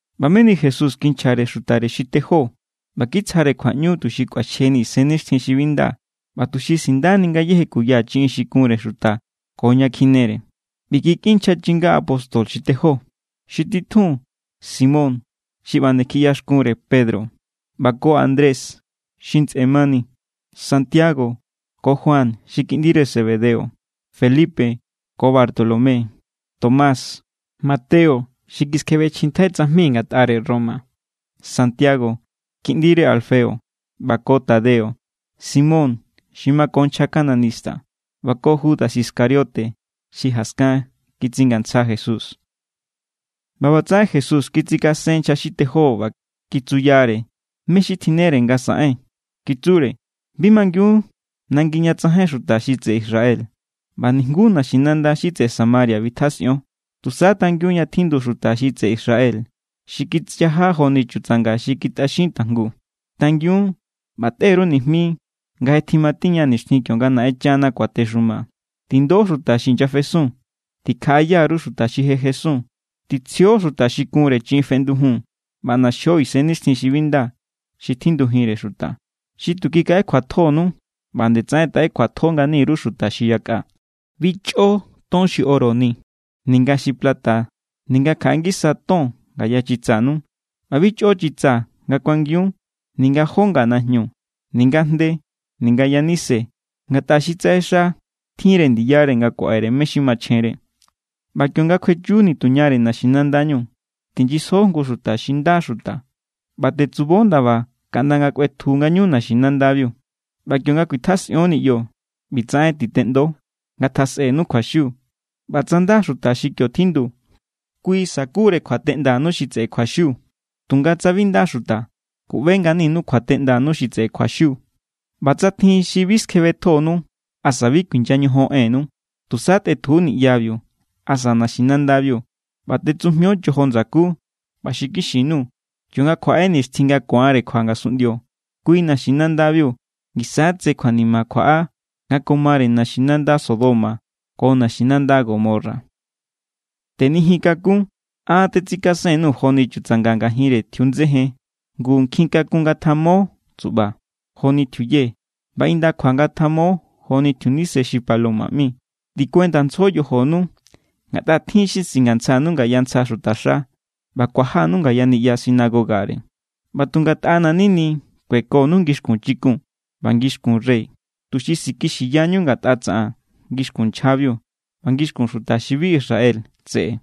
ꞌBa meni Jesús kinchjare xutare xi tejó ꞌba kitsjare kjuaꞌñu tuxi kꞌuaxjeni isennixtjin xi bi nda ꞌba tuxi sindani ngayéje kuya chiꞌin xi kunre xuta ko ña kjinere. ꞌBi kikꞌin nchja chinga apóstol xi tejó: xi titjun Simón xi ꞌba nde kjiꞌyaxkunre Pedro, ꞌba ko Andrés xi ntsꞌe mani; Santiago ko Juan xi kiꞌndire Zebedeo; Felipe ko Bartolomé; Tomás, Mateo xi kiskjebechjintjai tsajmi ngatꞌare Roma; Santiago kiꞌndire Alfeo, ꞌba ko Tadeo; Simón xi mako nchja cananista ꞌba ko Judas Iscariote xi jaskan kitsingantsja Jesús. ꞌBa ꞌbatsaꞌen Jesús kitsikasen nchja xi tejó ꞌba kitsuyare mé= xi tjinnere nga saꞌen. Kitsure: —Bi mangiun nangi ña tsajain xuta xi tseꞌe Israel. ꞌBa nijnguú naxinanda xi tseꞌe Samaria bitjasꞌion. Tusa tangiun ña tjindu xuta xi tseꞌe Israel xi kichaja joni chutsanga xi kitꞌaxin tajngu. Tangiun ꞌba tꞌe_ru nijmi nga je tjimatiña nixtjin kionga Naꞌenchana kuatexuma. Tindo xuta xi inyafesun, tikjaꞌaya_ru xuta xi je jesun, titsjio xuta xi kunre chiꞌin feꞌndujun, ꞌba ꞌnaxio isennixtjin xi bi nda xi tjindujinre xuta. Xi tu kikaꞌekjuatjonu, ꞌba=nde tsaꞌen taꞌe kjuatjo ngani_ru xuta xi yakꞌa. ’Bi chꞌo ton xi oro ni ninga xi plata ninga kjaꞌe ngisa ton ngaya chitsanu. ꞌBa bi chꞌo chitsa nga kuangiun, ninga jó nga najñu, ninga jnde, ninga yanise. Ngatꞌa xi tsaꞌexa tjinre ndiyare nga kuaꞌere mé= xi machjenre. ’ꞌBa kionga kjuechu nituñare naxinandañu, tijnyisjo jngu xuta xi nda xuta ꞌba tetsubo ndaba kaꞌnda nga kꞌuetju ngañu naxinandabiu. ꞌBa kionga kuitjasꞌion niꞌyo, ꞌbitsaꞌen titeꞌndo: “Ngatjasꞌenu kjuaxiu.” ꞌBa tsa nda xuta xi kio tjindu, kui sakure kjuateꞌndanu xi tseꞌe kjuaxiu. Tunga tsa bi nda xuta, kuꞌbe=nganinu kjuateꞌndanu xi tseꞌe kjuaxiu. ꞌBa tsa tjin xi bi skjebetjonu asa bi kuinya ñojon ennu, tusa tꞌetju niꞌyabiu asa naxinandabiu, ꞌba tꞌetsujmio chojo ndsakú. ꞌBa xinkixi_nuu̱, kionga kjuaꞌe nixtjin nga ku̱anre kjua ngasunꞌndio, kui naxinandabiu ngisa= tse kjuanima kjuaꞌa nga ko mare naxinanda Sodoma ko naxinanda Gomorra. ’Tenijin kakun. An tetsikasen_nuu̱ joni chutsanga ngajinre tjiundsejen. Ngu nkjinkakun ngatjamo tsuꞌba joni tjiuye, ꞌba indakjua ngatjamo joni tjiunise xi paloma ꞌmi. Tikuendantsjo yojonu, ngatꞌa tjin= xi singantsjanu ngaya ntsja xutaxa ꞌba kuajanu ngaya niꞌya sinagogare. ꞌBa tu ngatꞌana̱= nini kuekonu ngixkun chikun ꞌba ngixkun rey, tuxi sikixiyñu ngatꞌa tsaꞌan ngixkun nchjabiu ꞌba ngixkun xuta xi bi Israel tseꞌe.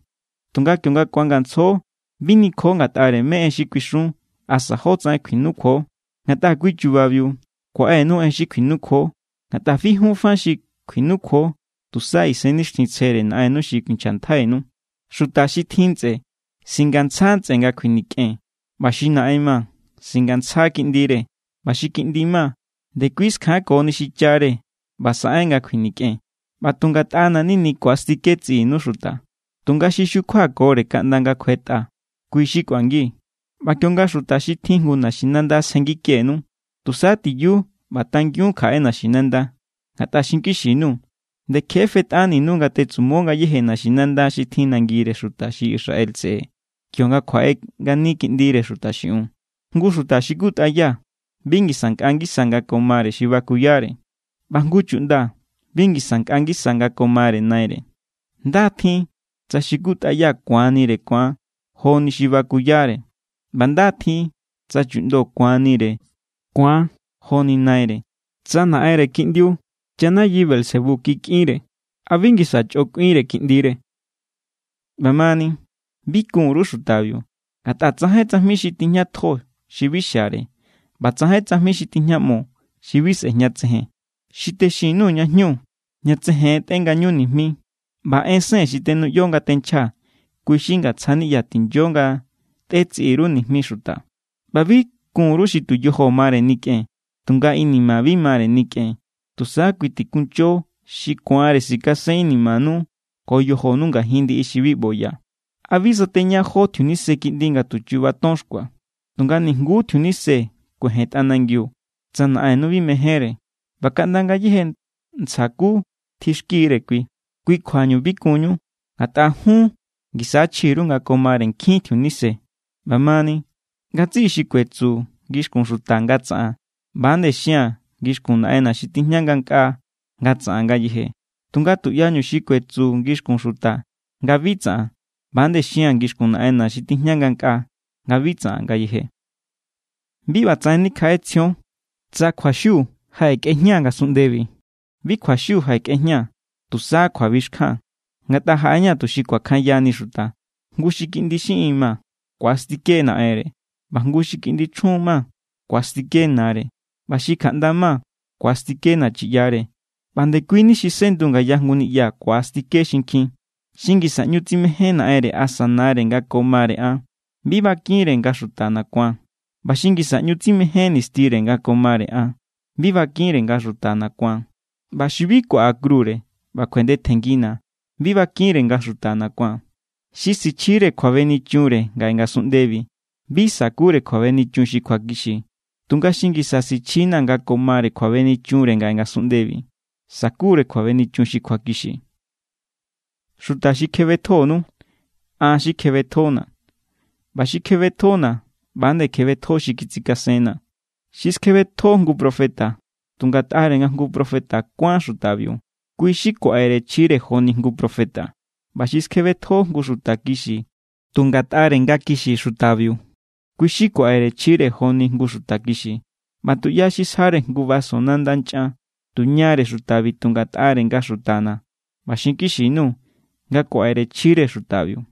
Tunga kionga ku̱angantsjo, bi nikjo ngatꞌare mé= en xi kuixun asa jótsaꞌen kjuinukjuo. Ngatꞌa kui chubabiu kuaꞌenu en xi kjuinukjuo. Ngatꞌa bi jun fa xi kjuinukjuo, tusa Isennixtjintsjere Naꞌennu xi kuinchjantjainu. ’Xuta xi tjin ntsꞌe singantsja ntsꞌe nga kjuinikꞌen, ꞌba xi naꞌen ma singantsja kiꞌndire, ꞌba xi kiꞌndi ma ndekui skjankoni xichare ꞌba saꞌen nga kjuinikꞌen. ꞌBa tu ngatꞌana̱= nini ku̱astike tsiꞌinu xuta. Tunga xi xukjuakore kaꞌnda nga kjuetꞌa, kui= xi kꞌuangi. ꞌBa kionga xuta xi tjin jngu naxinanda sjenngikenu, tusa tiyu ꞌba tangiun kjaꞌe naxinanda. Ngatꞌa xinkixi_nuu̱. Nde kje fetꞌaninu nga tetsumo ngayéje naxinanda xi tjin nangire xuta xi Israel tseꞌe kionga kjuaꞌe ngani Kiꞌndire Xuta xiꞌiun. ’Jngu xuta xi kutꞌaya bi ngisa nkꞌa ngisa nga ko mare xi bakuyare, ꞌba jngu chuꞌnda bi ngisa nkꞌa ngisa nga ko mare naire. Nda= tjin tsa xi kutꞌaya ku̱anire ku̱an joni xi bakuyare. ꞌBa nda= tjin tsa chuꞌndo ku̱anire ku̱an joni naire. Tsa naꞌenre kiꞌndiu chanayi Beelzebú kikꞌinre, ¿a bi ngisa chꞌo kꞌuinre kiꞌndire? ’ꞌBa mani, bi kun_ru xutabiu. Ngatꞌa tsajain tsajmi xi tijñatjo xi bi xiare, ꞌba tsajain tsajmi xi tijñaꞌmo xi bi sꞌejñatsejen. Xi texin_nuu̱ ña jñu, ña tsejen tꞌe ngañu nijmi. ꞌBa ensen xi tenuꞌyo nga tenchjaa̱, kui xi ngatsja niꞌya tinyo nga tꞌetsiꞌi_ru nijmi xuta. ꞌBa bi kun_ru xi tu yojo mare nikꞌen, tunga inima bi mare nikꞌen. Tusa kui tikuncho xi ku̱anre sikasen inimanu ko yojonu ngajin ndiꞌi xi bi ꞌboya. ’¿A bi sateña jó tjiunise kiꞌndi nga tu chu̱ba̱ ton xkua? Tunga nijnguú tjiunise kuejen tꞌanangiu, tsa Naꞌennu bi mejénre. ꞌBa kaꞌnda ngayéje ntsja ku tjixkire Kui. Kui kjuañu bi kunñu, ngatꞌa jun ngisa= chji_ru nga ko mare nkjin tjiunise. ’ꞌBa mani, ngatsiꞌi xi kuetsu ngixkun xuta nga tsaꞌan, ꞌba=nde xia̱n ngixkun Naꞌenna̱ xi tijña ngankꞌaa nga tsaꞌan ngayeje. Tunga tuꞌyañu xi kuetsu ngixkun xuta nga bi tsaꞌan, ꞌba=nde xia̱n ngixkun Naꞌenna̱ xi tijña ngankꞌaa nga bi tsaꞌan ngayeje. ’Bi ꞌbatsaꞌen nikjaꞌetsjion, tsa kjuaxiu jaꞌekꞌejñaa̱ ngasunꞌndebi. Bi kjuaxiu jaꞌekꞌejñaa̱, tusa kjuabixkjan. Ngatꞌa jaꞌeña̱ tuxi kuakjanyani xuta, jngu xi kiꞌndi xiꞌin ma ku̱astike naꞌenre, ꞌba jngu xi kiꞌndi chjun ma ku̱astike nare, ꞌba xi kjaꞌnda ma ku̱astike nachiꞌyare. ꞌBa ndekui ni xi sꞌendu ngaya jngu niꞌya ku̱astike xinkjin. ’Xi ngisa ꞌñu tsimején naꞌenre asa nare nga ko mare an, bi bakinre nga xutana̱ ku̱an. ꞌBa xi ngisa ꞌñu tsimején nistire nga ko mare an, bi bakinre nga xutana̱ ku̱an. ꞌBa xi bi kuaꞌa krure ꞌba kjuendetjenngina̱, bi bakinre nga xutana̱ ku̱an. Xi sichjire kjuabenichunre ngaꞌe ngasunꞌndebi, bi sakure kjuabenichun xi kjuakixi. Tunga xi ngisa sichjina̱ nga ko mare kjuabenichunre ngaꞌe ngasunꞌndebi, sakure kjuabenichun xi kjuakixi. ’Xuta xi kjebetjonu, an xi kjebetjona̱. ꞌBa xi kjebetjona̱, ꞌba=nde kjebetjo xi kitsikasenna̱. Xi skjebetjo jngu profeta tu ngatꞌare nga jngu profeta kuán xutabiu, kui= xi kuaꞌere chjire joni jngu profeta. ꞌBa xi skjebetjo jngu xuta kixi tu ngatꞌare nga kixi xutabiu, kui= xi kuaꞌere chjire joni jngu xuta kixi. ꞌBa tuꞌya xi sjare jngu vaso nanda nchꞌan tuñare xutabi tu ngatꞌare nga xutana̱, ꞌba xinkixi_nuu̱ nga kuaꞌere chjire xutabiu.